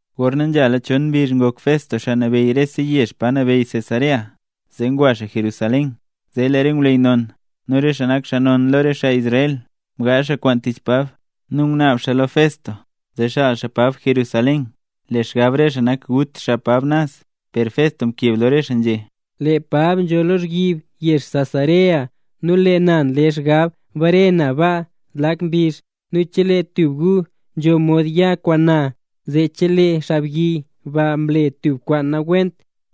Gorna nzhala chon mbizh ngok Festo xaa nabeyy rese yezh pa nabeyy Cesarea, zeera ngwa xaa Jerusalén. Zee lee re ngwleyy non, nu re xaa nak xaa non lo re xaa Israel, mgaazh xaa kwaan tich Pab. Nu ngunaab xaa lo Festo, zee xaal xaa Pab Jerusalén. Lee xgab re xaa nak gut xaa Pab naz. Per Festo mkeb lo re xaa nzhé: —Lee Pab nzho lozhyib yezh Cesarea, nu lee na nle xgab bare na naz ba zlak mbizh. Nu chelee tub gu nzho mod ya kwaan na, zee chelee xaabyi ba mle tub kwaan nawent,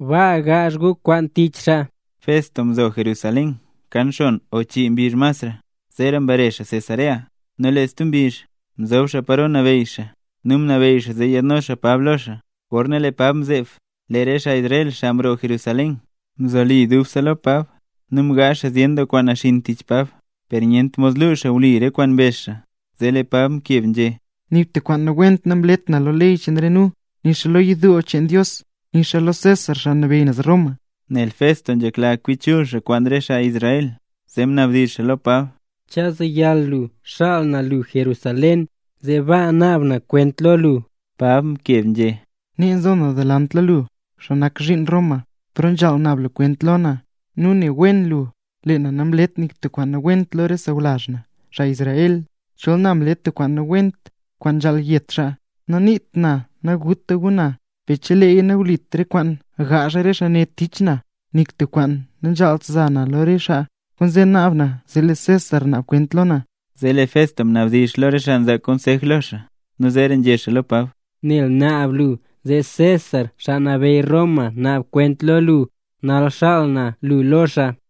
baa gaazh gu kwaan tich xaa. Festo mzo Jerusalén kan xon o chii mbizh masra, zeera mbare xaa Cesarea. Nu lee stub mbizh, mzob xaa paro nabeyy xaa, nu mnabeyy xaa zee yaadno xaa Pab lo xaa. Gorna lee Pab mzeeb, lee re xaa Israel, xaa mroo Jerusalén, mzoli dubse lo Pab nu mgaazh xaa zyen doo kwaan naxinn tich Pab, per nyent mod lu xaa wli re kwaan mbezh xaa. Zee lee Pab mkeb nzhé: —Nik tub kwaan nawent namlet na lo ley cheen re nu; nu nixa lo yidoo cheen Dios; nixa lo César, xaa nabeyy naz Roma. Nel Festo nzhekla xaa kwi chul xaa kwaan re xaa Israel, zee mnabdizh xaa lo Pab: —¿Chu zeyal lu xaal na lu Jerusalén, zee baa naab na kwent lo lu? Pab mkeb nzhé: —Nee nzo na delant lo lu, xaa nak zhiin Roma, paro nzhaal naab lu kwent lo na; nu ne wen lu, lee na namlet nik tub kwaan nawent lo re sawlazh na, xaa Israel. Chol na mle na tub kwaan nawent, kwaan nzhaal yet xaa, naniit na naguta gu na; per cheleeya nawlit re kwaan ngaazh re xaa ne tich na, nik tub xaa nanzhaalt zaa na lo re xaa. Kwaanzee naab na zee lee César naab kwent lo na. Zee lee Festo mnabdizh lo re xaa nzaa konsej lo xaa, nu zeera nzhé xaa lo Pab: —Nel mnaab lu zee César, xaa nabeyy Roma, naab kwent lo lu, nal xaal na lu lo xaa.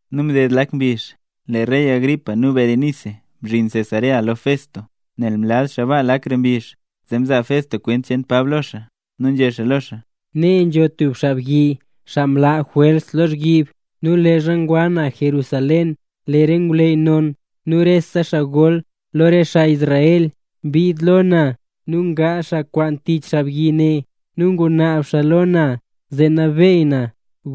Nu mded lak mbizh, lee rey Agripa nu Berenice mzhin Cesarea lo Festo. Nel mlaz xaa baa lakra mbizh, zee mzaa Festo kwent cheen Pab lo xaa. Nu nzhé lo xaa: —Nee nzho tub xaabyi, xaa mlaa Jwels lozhyib. Nu leezha ngwa na Jerusalén, lee re ngwleyy non nu re xaa gol lo re xaa Israel, mbid lo na nu mgaazh xaa kwaan tich xaabyi ne, nu ngunaab xaa lo na zee nabeey na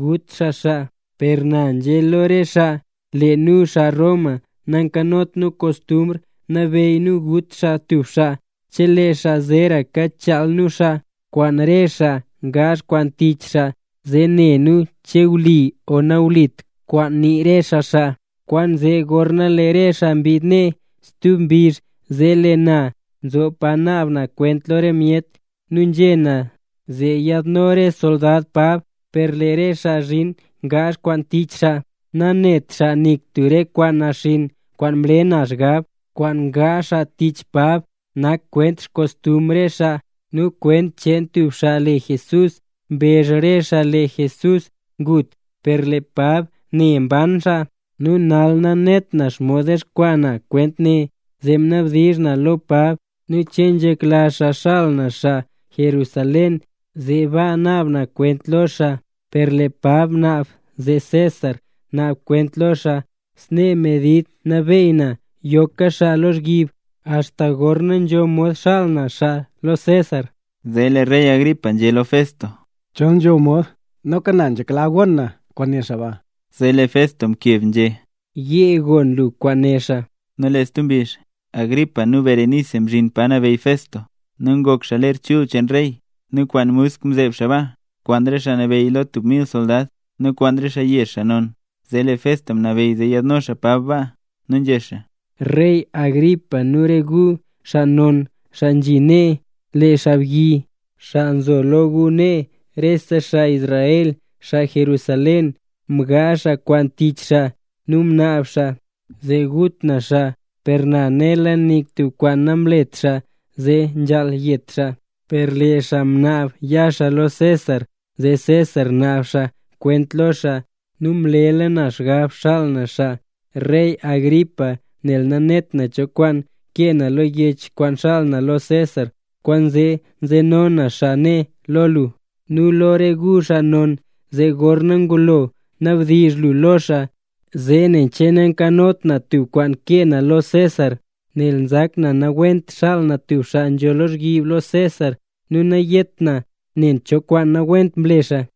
gut xaa xaa. Per na nzhé lo re xaa: “Lee nu xaa Roma, nankanot nu kostumbr nabeyy nu gut xaa tub xaa cheleeya zeeraka chaal nu xaa kwaan re xaa ngaazh kwaan tich xaa, zee ne nu che wli o nawlit kwaan nii re xaa xaa”. Kwaanzee gorna lee re xaa mbid nee, stub mbizh zee lee na mzob pa naab na kwent lo re myet, nu nzhé na zee yaadno re soldad Pab. Per lee re xaa mzhin ngaazh kwaan tich xaa, nanét xaa nik tub re kwaan naxinn kwaan mle na xgab. Kwaan ngaazh xaa tich Pab nak kwent xkostumbr re xaa nu kwent cheen tub xaa le Jesús. Mbezh re xaa lee Jesús ngut, per lee Pab né naban xaa. Nu nal nanet na xomod dexkwaa na kwent ne, zee mnabdizh na lo Pab, nen che nzhekla xaa xaal na xaa Jerusalén zee baa naab na kwent lo xaa. Per lee Pab mnaab zee César naab kwent lo xaa. Snee medid mnabeey na yoka xaa lozhyib, axta gorna nzho mod xaal na xaa lo César. Zee lee rey Agripa nzhé lo Festo: —Chol nzho mod, noka na nzhekla gon na kwaan né xaa ba. Zee lee Festo mkeb nzhé: —Yee gon lu kwaan né xaa. Nu lee stub mbizh, Agripa nu Berenice mzhin pa nabeyy Festo nu ngok xaa ler chul cheen rey, nu kwaan musk mzeeb xaa baa, kwaan re xaa nabeyy tub mil soldad, nu kwaan re xaa yezh, xaa non. Zee lee Festo mnabeyy zee yaadno xaa Pab baa. Nu nzhé xaa: —Rey Agripa nu re gu, xaa non, xaa nzhi nee. Lee xaabyi, xaa nzo lo gu nee, rese xaa Israel, xaa Jerusalén mgaazh xaa kwaan tich xaa, nu mnaab xaa gut na xaa. Per na, nela nik tub kwaan namlet xaa zee nzhaal yet xaa. Per lee xaa mnaab ya xaa lo César, zee César naab xaa kwent lo xaa, nu mlela na xgab xaal na xaa. Rey Agripa, nel nanet na cho kwaan kee na lo yech kwaan xaal na lo César, kwaanzee nzeno na xaa ne lo lu, nu lo re gu xaa non, zee gorna ngulo nabdizh lu lo xaa, zee ne che nankanot na tub kwaan kee na lo César. Nel nzak na nawent xaal na tub xaa nzho lozhyib lo César, nu nayét na nen cho kwaan nawent mle xaa.